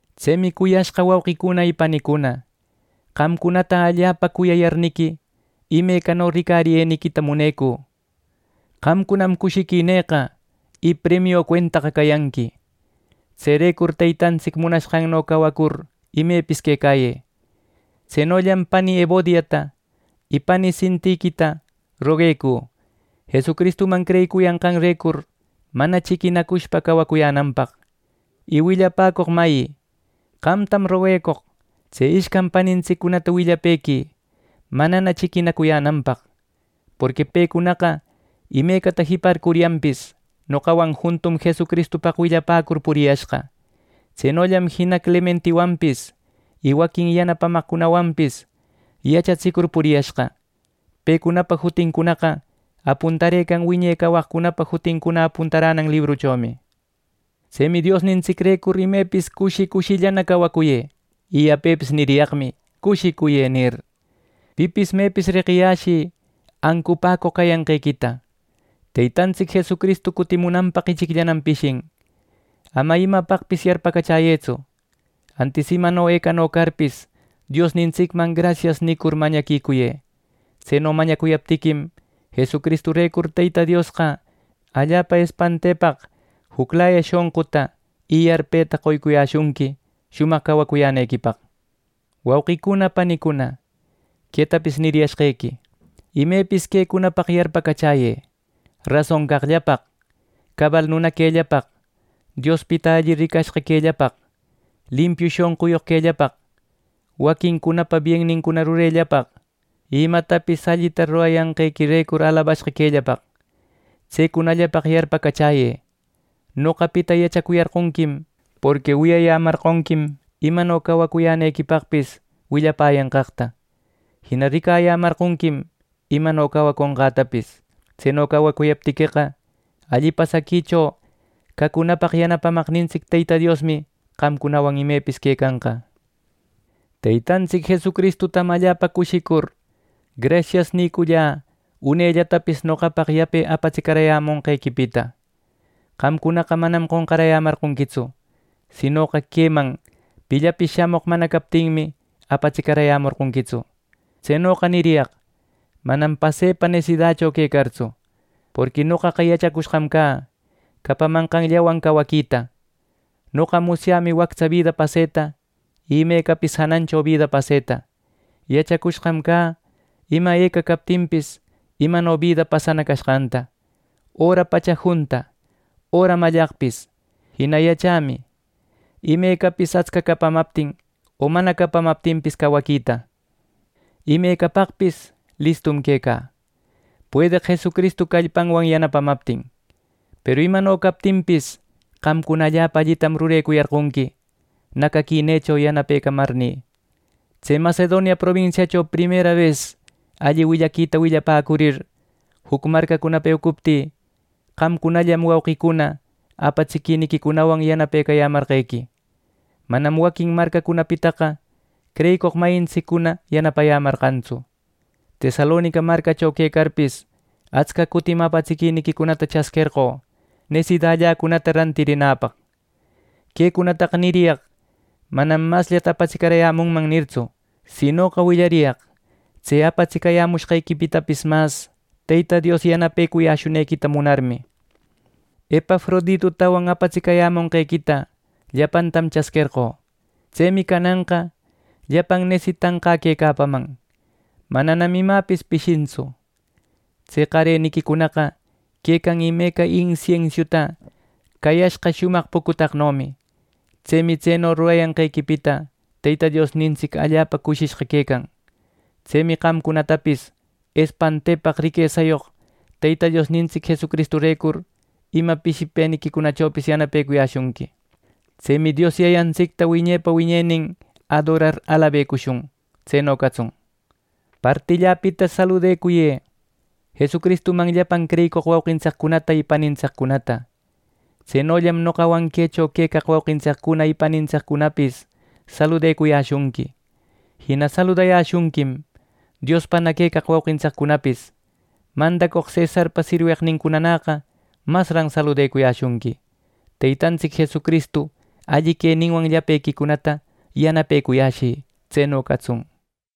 Tsemi cuyashqa wauqicuna panicuna, qamcunata allapa cuyayarniqui imecano ricariyeniquita munecü. Qamcunam cushiquinïqa y premio cuentaqa cayanqui. Tserecur Teytantsic munashqanno cawacur imepis quecayë. Tsenollam, pani Evodiata, y pani Sintiquita roguecü Jesucristuman creyicuyanqanrecur mana chiquinacushpa cawacuyänanpaq. Y willapäcoq mayi, qamtam roguecoq: Tse ishcan panintsiccunata willapëquï manana chiquinacuyänanpaq; porqui pecunaqa imecata jiparcuryanpis noqawan juntum Jesucristupaq willapäcur puriyashqa. Tsenollam jina Clementiwanpis y waquin yanapamaqcunawanpis yachatsicur puriyashqa. Pecunapa jutincunaqa apuntarëcan wiñe cawaqcunapa jutincuna apuntaränan libruchomi. Tsemi Diosnintsicrecur imepis cushi, cushillana cawacuyë, y yapepis niriyaqmi “Cushicuyë” nir. Pipis mepis reqiyäshï ancupäcoq cayanqequita. Teytantsic Jesucristu cutimunanpaq ichicllanam pishican. Ama imapaqpis yarpacachäyëtsu, antis imano ecano carpis, Diosnintsicman “Grasias” nicur mañaquicuyë. Tseno mañacuyaptiquim, Jesucristurecur Teyta Diosqa allapa espantepaq juclaya shonquta, y yarpeta qoyashunqui shumaq cawacuyänequipaq. Wauqicuna panicuna, quetapis niriyashqequi: Imepis quecunapaq yarpacachäyë: rason caqllapaq, cabal nuna quellapaq, Diospita alli ricashqa quellapaq, limpiu shonquyoq quellapaq, waquincunapa biennincuna rurecunallapaq y imatapis allita rurayanqequirecur alabashqa quellapaq. Tsecunallapaq yarpacachäyë. Noqapita yachacuyarqonquim, porqui wiyayämarqonquim imano cawacuyänequipaqpis willapäyanqaqta. Jina ricayämarqonquim imano cawaconqätapis. Tseno cawacuyaptiqueqa, alli pasaquicho cacunapaq yanapamaqnintsic Teyta Diosmi qamcunawan imepis quecanqa. Teytantsic Jesucristutam allapa cushicur, “Grasias” nicullä unellatapis noqapaq yape apatsicarayämonqequipita. Qamcunaqa manam qonqaräyämarqonquitsu; sinoqa queman pillapis shamoq mana captinmi apatsicarayämorqonquitsu. Tsenoqa niriyaq manam pasepa nesidacho quecartsu, porqui noqaqa yachacushqam cä capamanqanllawan cawaquita. Noqa musyämi wactsa bida paseta y imecapis janancho bida paseta. Yachacushqam cä ima eca captinpis, imano bida pasana cashqanta, öra pacha junta öra mallaqpis. Jina yachämi imecapis atsca capamaptin o mana capamaptinpis cawaquita. Imecapaqpis listum quecä, puedeq Jesucristu callpanwan yanapamaptin. Peru imano captinpis, qamcuna allapa allitam rurecuyarqonqui, nacaquinïcunacho yanapecayämarnï. Tse Macedonia probinsiacho primera bes alli willaquita willapäcurir, juc marcacunapa eucuptï, qamcunallam wauqicuna, apatsiquiniquicunawan yanaparcayämarqequi. Manam waquin marcacunapitaqa creyicoq mayintsiccuna yanapayämarqantsu. Tesalonica marcacho quecarpis, atsca cutim apatsiquiniquicunata chasquerqö nesidalläcunata rantirinäpaq. Quecunataqa niriyaq manam “Masllata apatsicarayämunman” nirtsu; sinoqa willariyaq tse apatsicayämushqequipitapis mas Teyta Dios yanapecuyäshunequita munarmi. Epafroditutawan apatsicayämunqequita llapantam chasquerqö. Tsemi cananqa llapan nesitanqä quecapaman, mananam imäpis pishintsu. Tse qareniquicunaqa quecan imeca insiensiuta cayashqa shumaq pucutaqnomi. Tsemi tseno rurayanqequipita Teyta Diosnintsic allapa cushishqa quecan. Tsemi qamcunatapis espantepaq riquesayoq Teyta Diosnintsic Jesucristurecur ima pishipëniquicunachopis yanapecuyäshunqui. ¡Tsemi Dios Yayantsicta wiñepa wiñenin adorar alabecushun! Tseno catsun. Partilläpita saludacuyë, Jesucristuman llapan creyicoq wauqintsiccunata y panintsiccunata. Tsenollam noqawan quecho quecaq wauqintsiccuna y panintsiccunapis saludecuyäshunqui. Jina saludayäshunquim Diospana quecaq wauqintsicunapis. Mandacoq cesarpa sirweqnincunanäqa masran saludecuyäshunqui. Teytantsic Jesucristu alli queninwan llapequicunata yanapecuyäshï. Tseno catsun.